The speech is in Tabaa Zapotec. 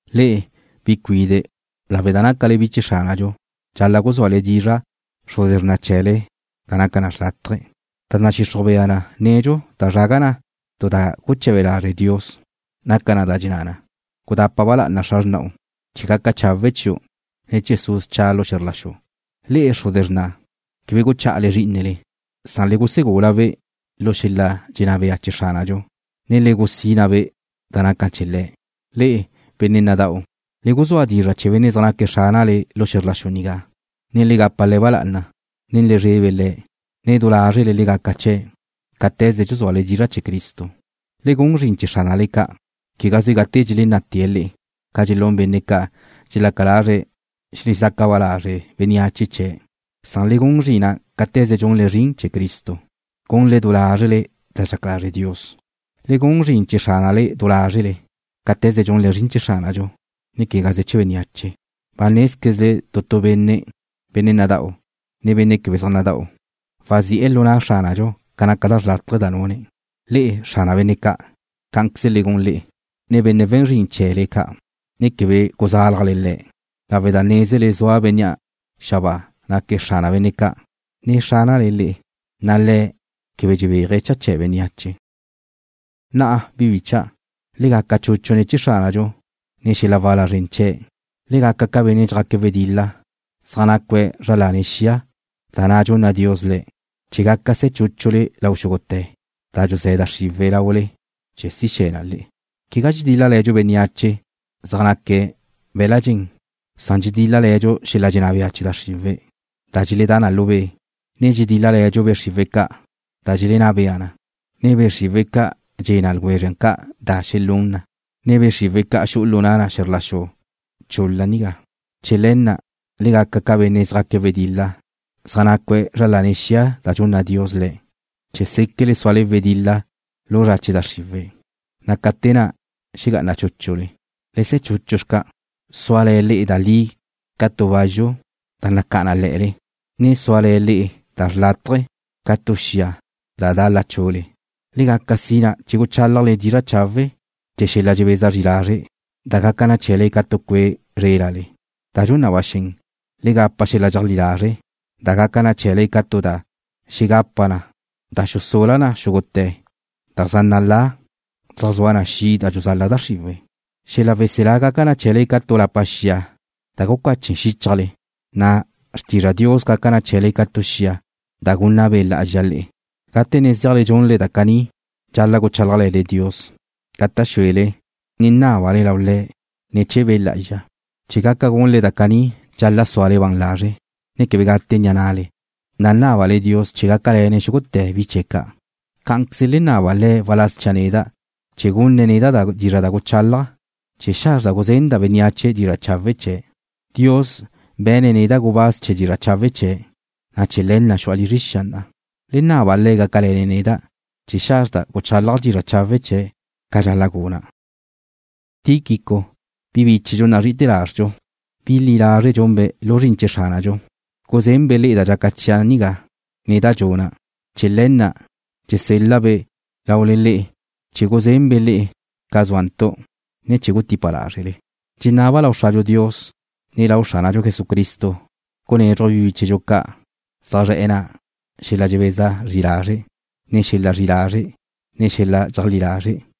Le'e, bi cuide', lawe' da nácale bi chee̱ Xránadxu, dxal-la' guzúale dizra' xruze xrna chee̱le, da naca na xlátaje̱. Da nadxixruj bea nedxu da zraga na tu da guche̱be lazre' Dios naca na da dxenná na: Gudapa ba lá'ana xra xrna'u, chee̱ gaca chawe' chiu', ne chee̱ su' scha' lu xe̱zr la xu. Le'e, xruze xrna', quebe guchá'ale zrí'inele. Le gusegula-be' lu xel-la dxenná bea chee̱ Xránadxu, ne le gusina-be' da naca chee̱ Le̱'. Le'e, benne' nada'u, le guzúa dizra' chee̱ benne' zaj naque̱' xránale lu xe̱zr la xu nigá, ne le gapa le̱' ba lá'ana, ne le zrebe le̱', ne du lázrele le gaca chee̱', cáte̱ze dxuzúale dizra' chee̱ Cristo. Le gun zrin chee̱ xránale ca', quegaze gate dxelenná'te̱' le'e, ca dxelún benne' ca' dxelaca lazre̱' xelezaca ba lazre' bénneache chee̱'. Le gun zrin na' cáte̱ze dxunle zrin chee̱ Cristo, gunle du lázrele da dxaca lazre' Dios. Le gun zrin chee̱ xránale du lázrele, cáte̱ze dxunle zrin chee̱ Xránadxu, ne quegaze chee̱ bénneache. Ba nézquezle tu tu benne', benne' nada'u, ne benne' quebe nada'u, wazi'e̱ lu na' Xránadxu ca naca da xrlátaje da nune̱'. Le'e, xrana benne' ca', cá'anqueze le gun le'e nen benne' we̱n zrin chee̱le ca', ne quebe guzálajle le̱' lawe' da nézele zua Bénnea' xabáa naque̱' Xrana benne' ca', ne Xránale le'e, na' Le̱' quebe dxebéaje̱' cha chee̱ bénneache. Na'a, bi bícha'dau', le gaca chuchu ne̱ chee̱ Xránadxu nen xel-la wala zren chee̱'. Le gaca ca benne' zjaque̱' wedil-la zaj nácue̱' zra lane̱' xia da na' dxunna Dios le'e, chee̱ gaca se̱ chúchule lau xúgute̱ da dxuzé̱ da xriwe̱' laule chee̱ si xe̱ na le'e. Quegá dxedíl-lale̱dxu bénneache zaj naque̱' be̱la' dxen. Dxedíl-lale̱dxu xel-la dxenná bea chee̱ da xriwe̱' da dxeledá na lu be', ne dxedíl-lale̱dxu be' xriwe̱' ca', da dxelenná bea na, ne be' xriwe̱' ca' dxe̱ na ljwezre ca' da xelún na, ne be' xriwe̱' ca' xu'u lu na' na xe̱zr la xu chul-la nigá. Chee̱ le̱ na', le gaca ca benne' zjaque̱' wedil-la zaj nacue̱' zra lane̱' xia da dxunna Dios le'e, chee̱ séquele súale wedil-la lu zra che da xriwe', na' ca te na' xegá'ana chúchule. Le se̱ chuchu xca', suale̱ le'e da li ca tu bazxu da nacá'a na le̱'e̱le, ne suale̱ le'e da xlátaje̱ ca tu xia da da' lachu'le. Le gaca sina chee̱ guchálajle dizra' chawe' chee̱ xel-la dxebeza zri lazre', da gaca na chee̱le ca tu cue' zrélale. Da dxun na ba xen, le gapa xel-la dxeajlí lazre', da gaca na chee̱le ca tu da xegapa na, da xusula na xúgute̱ da zaj nalá na zaj zua na xi' da dxuzala da xriwe̱'. Xel-la weselá gaca na chee̱le ca tu lapa xia da gucache xíchajle, na' xrtizra Dios gaca na chee̱le ca tu xia da gunna Be' Lá'azxa le'e. Gate ne dxunle da caní dxal-la' guchálajle̱le Dios, gata' xúele, ne nábale lau Le̱' ne̱ chee̱ Be' Lá'azxa. Chee̱ gaca gunle da caní dxal-la' súale ban lazre', ne quebe gate ni'a na'le, na' nábale Dios chee̱ gácale̱ne̱' xúgute̱ bi chee̱' ca'. Cá'anqueze le naba Le̱' waláz chia' neda' chee̱ gunne̱' neda' dizra' da guchálaja', chee̱ xazrda' guzenda' bénneache dizra' chawe' chee̱'. Dios be̱ne̱' neda' gubáz chee̱ dizra' chawe' chee̱', na' chee̱ le̱ na' xu'a lizre xia na'a. Le naba Le̱' gácale̱ne̱' neda' chee̱ xazrda' guchálaja' dizra' chawe' chee̱' ca dxal-la' guna'. Tíquico, bi bíchedxu nazri'ite̱ lazrdxu, bi li lazre' lu zrin chee̱ Xránadxu, guzenbe' le'e da dxaca chia' nigá, ne da dxuna'. Chee̱ le̱ na' dxusel-la'-be' lau le'e chee̱ guzenbe' le'e ca zúantu', ne chee̱ gutípabe' lázrele. Dxenaba' lau Xradxu Dios, ne lau Xránadxu Jesucristo gunézruje̱' bi bíchedxu ca' zaj zre̱'e̱ na' xel-la dxebeza zri lazre', ne xel-la zri'i lazre', ne xel-la dxeajlí lazre',